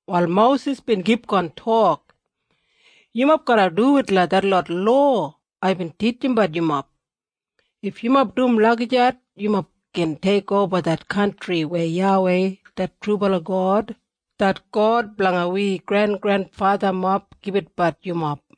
Wal Mosis bin kipgon tok, “Yumob garra duwit langa detlot lowa aibin titjimbat yumob. If yumob dum lagijat yumob gin teikoba det kantri weya YAWEI det trubala God, det God blanga wi grengrenfathamob gibitbat yumob.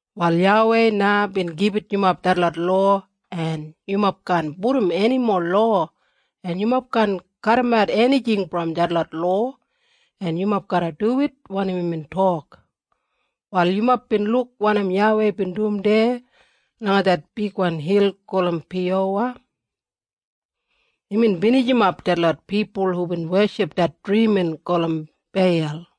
Wal YAWEI na bin gibit yumob detlot lowa en yumob kaan pudum enimo lowa en yumob kaan kadimat enijing brom detlot lowa en yumob garra duwit wanim imbin tok. Wal yumob bin luk wanim YAWEI bin dum deya langa det bigwan hil gulum Piyowa. Imbin binijimap detlot pipul hubin weship det drimin gulum Beil.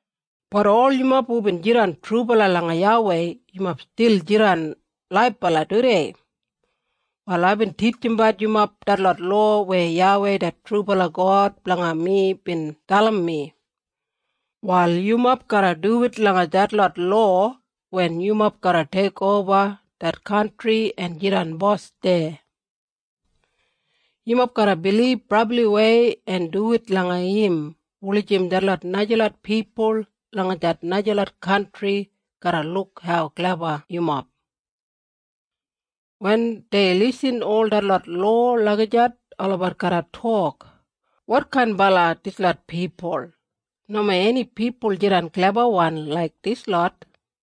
Bat ol yumob hubin jidan trubala langa YAWEI, yumob stil jidan laibala tudei. “Wal aibin titjimbat yumob detlot lowa weya YAWEI det trubala God blanga mi bin dalim mi. Wal yumob garra duwit langa detlot lowa wen yumob garra teikoba det kantri en jidan bos deya. Yumob garra bilib brabliwei en duwit langa im, wulijim detlot najalot pipul langa det najalot kantri garra luk hau kleba yumob. Wen dei irrim ol detlot lowa lagijat olabat garra tok, ‘Wotkainbala dislot pipul? Nomo eni pipul jidan klebabalawan laik dislot.’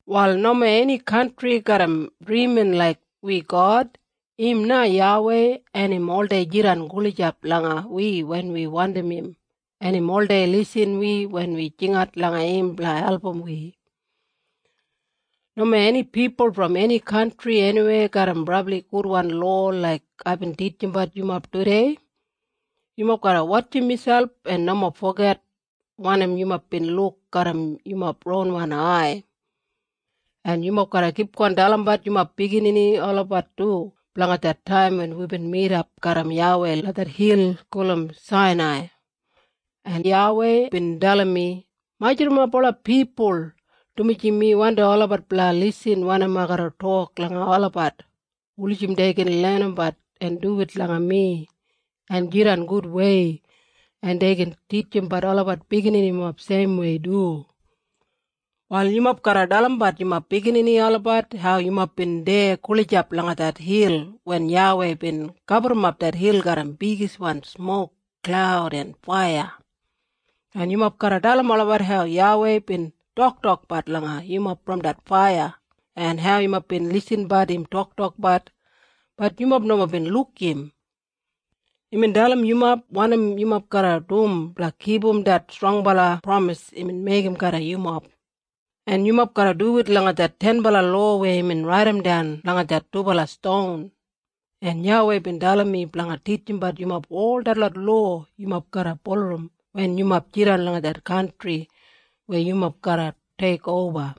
“Wal nomo eni kantri garram drimin laik wi God. Im na YAWEI en im oldei jidan gulijap langa wi wen wi wandim im, en im oldei irrim wi wen wi jingat langa im blanga album wi. Nomo eni pipul brom eni kantri eniweya garram brabli gudwan lowa laik aibin titjimbat yumob tudei. Yumob garra wotjim miselp en nomo foget wanim yumob bin luk garram yumob ronwan ai. En yumob garra kipgon dalimbat yumob biginini olabat du blanga det taim wen wibin midap garram YAWEI langa det hil gulum Sainai. En YAWEI bin dalim mi, ‘Majurrumap ola pipul, dumaji mi wandim olabat blanga irrim wanim ai garra tok langa olabat, wulijim dei gin lenimbat en duwit langa mi en jidan gudwei, en dei gin titjimbat olabat bigininimob seimwei du.’ “Wal yumob garra dalimbat yumob biginini olabat hau yumob bin deya gulijap langa det hil wen YAWEI bin gaburrumap det hil garram bigiswan smok, klaud en faiya. En yumob garra dalim olabat hau YAWEI bin toktokbat langa yumob brom det faiya, en hau yumob bin irrimbat im toktokbat, bat yumob nomo bin luk im. Imbin dalim yumob wanim yumob garra dum blanga kipum det strongbala pramis imbin meigim garram yumob, en yumob garra duwit langa det tenbala lowa weya imbin raidimdan langa det dubala ston. En YAWEI bin dalim mi blanga titjimbat yumob ol detlot lowa yumob garra bulurrum wen yumob jidan langa det kantri weya yumob garra teikoba.”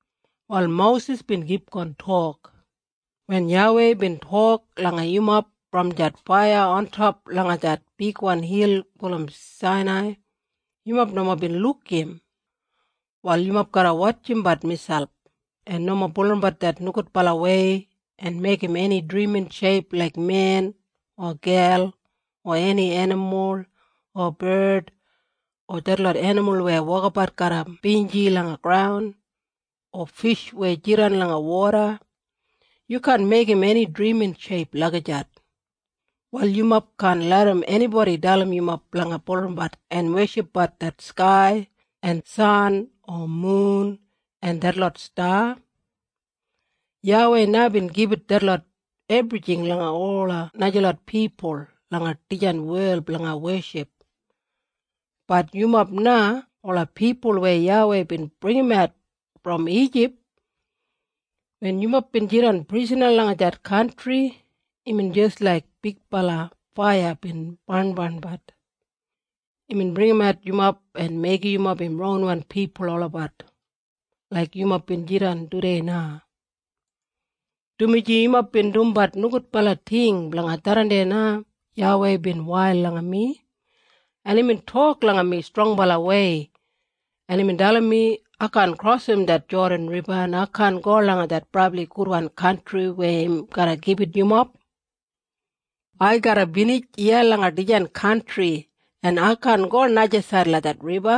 Wal Mosis bin kipgon tok, “Wen YAWEI bin tok langa yumob brom det faiya ontop langa det bigwan hil gulum Sainai, yumob nomo bin luk im. Wal yumob garra wotjimbat miselp, en nomo bulurrumbat det nogudbalawei en meigim eni drimin sheip laik men, o gel, o eni enimul, o bard, o detlot enimul weya wokabat garram binji langa graun, o fish weya jidan langa woda. Yu kaan meigim eni drimin sheip lagijat. Wal yumob kaan larram enibodi dalim yumob blanga bulurrumbat en weshipbat det skai, en san en mun en detlot sta. YAWEI na bin gibit detlot ebrijing langa ola najalot pipul langa dijan wel blanga weship. Bat yumob na ola pipul weya YAWEI bin bringimat brom Ijip. Wen yumob bin jidan prisana langa det kantri imbin jis laik bigbala faiya bin barnbarnbat. Imbin bringimat yumob en meigim yumob im ronwan pipul olabat, laik yumob jidan tudei na. Dumaji yumob bin dumbat nogudbala ting, blanga tharran na YAWEI bin wail langa mi, en imbin tok langa mi strongbalawei, en imbin dalim mi ai kaan krosim det Jodan Riba en ai kaan go langa det brabli gudwan kantri weya im garra gibit yumob. Ai garra binij iya langa dijan kantri en ai kaan go najasaid langa det riba,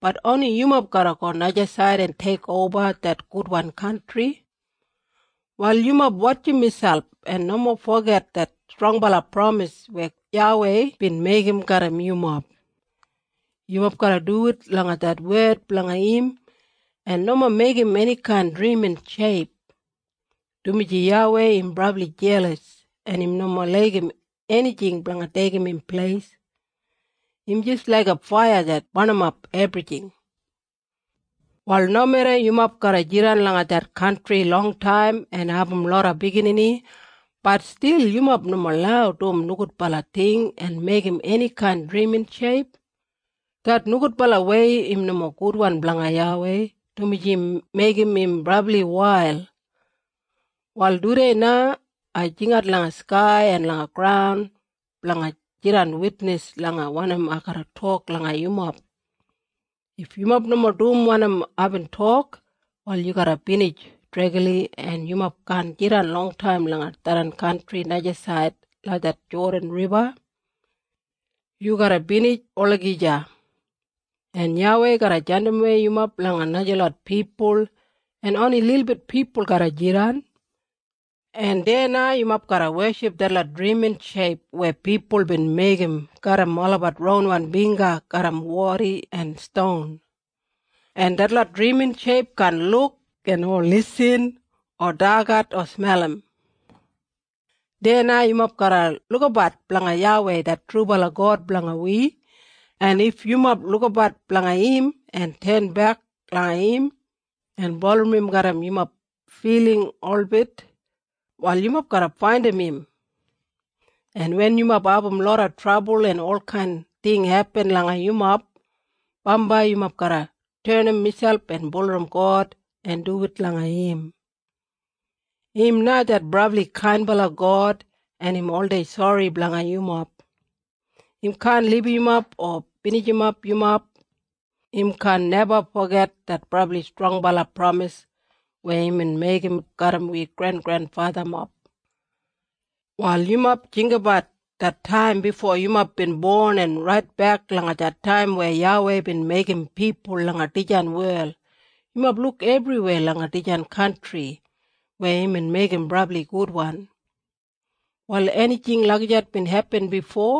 bat oni yumob garra go najasaid en teikoba det gudwan kantri. “Wal yumob wotjim miselp en nomo foget det strongbala pramis weya YAWEI bin meigim garram yumob. Yumob garra duwit langa det wed blanga im, en nomo meigim enikain drimin sheip, dumaji YAWEI im brabli jelas en im nomo laigim enijing blanga deigim im pleis. Im jis laiga faiya det barnimap ebrijing. “Wal nomeda yumob garra jidan langa det kantri longtaim en abum loda biginini, bat stil yumob nomo lau dum nogudbala ting en meigim enikain drimin sheip. Det nogudbalawei im nomo gudwan blanga YAWEI, dumaji im meigim im brabli wail. Wal tudei na ai jingat langa skai en langa graun blanga jidan witnis langa wanim ai garra tok langa yumob. If yumob nomo dum wanim aibin tok, wal yu garra binij dregli en yumob kaan jidan longtaim langa tharran kantri najasaid langa det Jodan Riba. Yu garra binij olagija. En YAWEI garra jandimwei yumob langa najalot pipul en oni lilbit pipul garra jidan. En deya na yumob garra weship detlot drimin sheip weya pipul bin meigim garram olabat ronwan bingga garram wadi en ston, en detlot drimin sheip kaan luk o irrim o dagat o smelim. Deya na yumob garra lukabat blanga YAWEI det trubala God blanga wi, en if yumob lukabat blanga im en tenbek langa im en bulurrum im garram yumob filing holbit, wal yumob garra faindim im. En wen yumob abum loda trabul en olkain ting hepin langa yumob, bambai yumob garra tenim miselp en bulurrum God en duwit langa im. Im na det brabli kainbala God en im oldei sori blanga yumob. Im kaan libum yumob o binijimap yumob. Im kaan neba foget det brabli strongbala pramis weya imbin meigim garram wi grengrenfathamob. “Wal yumob jinggabat det taim bifo yumob bin bon en raitbek langa det taim weya YAWEI bin meigim pipul langa dijan wel. Yumob luk ebriweya langa dijan kantri weya imbin meigim brabli gudwan. Wal enijing lagijat bin hepin bifo?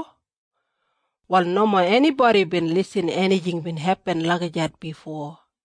Wal nomo enibodi bin irrim enijing bin hepin lagijat bifo.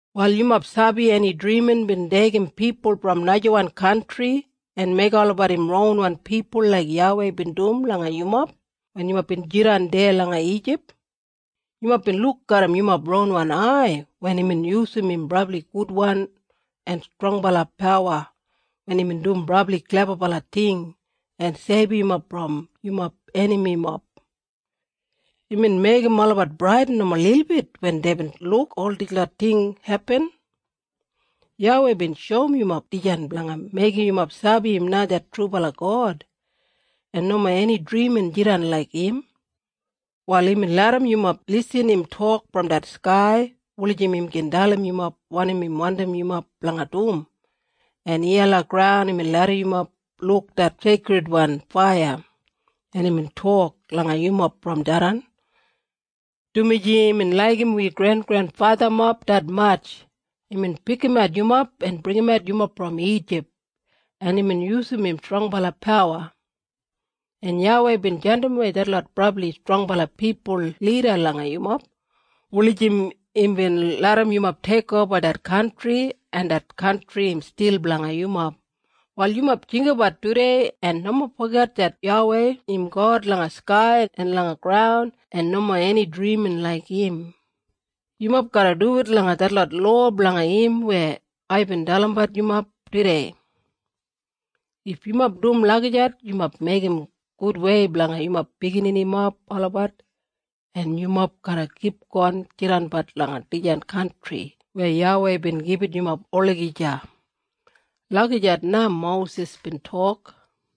Wal yumob sabi eni drimin bin deigim pipul brom najawan kantri en meigim olabat im ronwan pipul laik YAWEI bin dum langa yumob wen yumob bin jidan deya langa Ijip? Yumob bin luk garram yumob ronwan ai wen imbin yusum im brabli gudwan en strongbala pawa wen imbin dum brabli klebabala ting en seibum yumob brom yumob enamimob. Imbin meigim olabat bradin nomo lilbit wen deibin luk ol dislot ting hepin. YAWEI bin shoum yumob dijan blanga meigim yumob sabi im na det trubala God, en nomo eni drimin jidan laik im. Wal imbin larram yumob irrim im tok brom det skai, wulijim im gin dalim yumob wanim im wandim yumob blanga dum, en iya langa graun imbin larram yumob luk det seikridwan faiya, en imbin tok langa yumob brom tharran. Dumaji imbin laigim wi grengrenfathamob detmatj imbin pikimat yumob en bringimat yumob brom Ijip en imbin yusum im strongbala pawa. En YAWEI bin jandimwei detlot brabli strongbala pipul lida langa yumob, wulijim imbin larram yumob teikoba det kantri, en det kantri im stil blanga yumob. Wal yumob jinggabat tudei en nomo foget det YAWEI im God langa skai en langa graun en nomo eni drimin laik im. Yumob garra duwit langa detlot lowa blanga im weya aibin dalimbat yumob tudei. If yumob dum lagijat yumob meigim gudwei blanga yumob bigininimob olabat, en yumob garra kipgon jidanbat langa dijan kantri weya YAWEI bin gibit yumob olagija.” Lagijat na Mosis bin tok.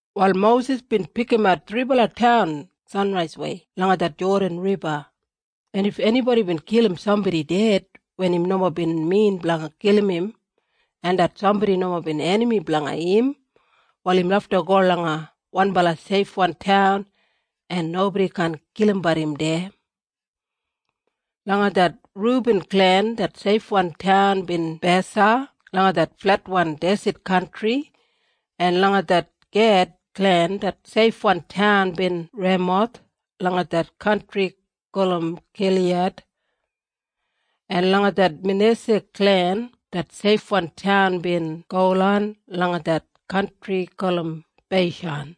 Wal Mosis bin pikimat thribala taun sanraiswei langa det Jodan Riba, en if enibodi bin kilim sambodi ded wen im nomo bin min blanga kilim im, en det sambodi nomo bin enami blanga im, wal im lafta go langa wanbala seifwan taun en nobodi kaan kilimbat im deya. Langa det Rubin klen det seifwan taun bin Besa langa det fletwan deset kantri. En langa det Ged klen det seifwan taun bin Remoth langa det kantri gulum Giliyad. En langa det Manesa klen det seifwan taun bin Golan langa det kantri gulum Beishan.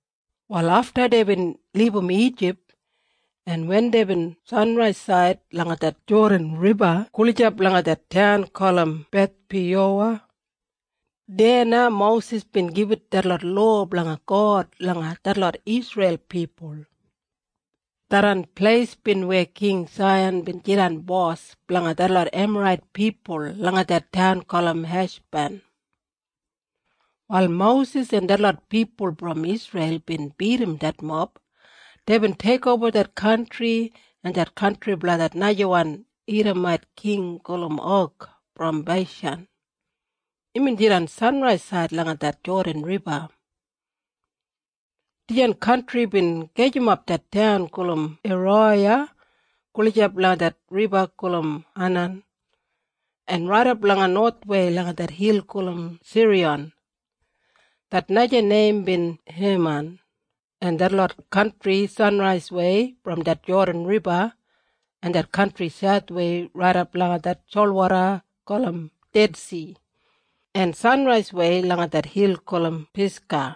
Wal afta deibin libum Ijip en wen deibin sanraisaid langa det Jodan Riba gulijap langa det taun gulum Bethpiyowa, deya na Mosis bin gibit detlot lowa blanga God langa detlot Isreil pipul. Tharran pleis bin weya King Saihan bin jidan bos blanga detlot Emarait pipul langa det taun gulum Heshban. Wal Mosis en detlot pipul brom Isreil bin bidim detmob. Deibin teikoba det kantri, en det kantri blanga det najawan Idamait king gulum Og brom Beishan. Imbin jidan sanraisaid langa det Jodan Riba. Dijan kantri bin gajimap det taun gulum Eroya, gulijap langa det riba gulum Anan en raidap langa nowathwei langa det hil gulum Siriyon, det naja neim bin Heman, en detlot kantri sanraiswei brom det Jodan Riba en det kantri sauthwei raidap langa det solwoda gulum Dedsi, en sanraiswei langa det hil gulum Pisga.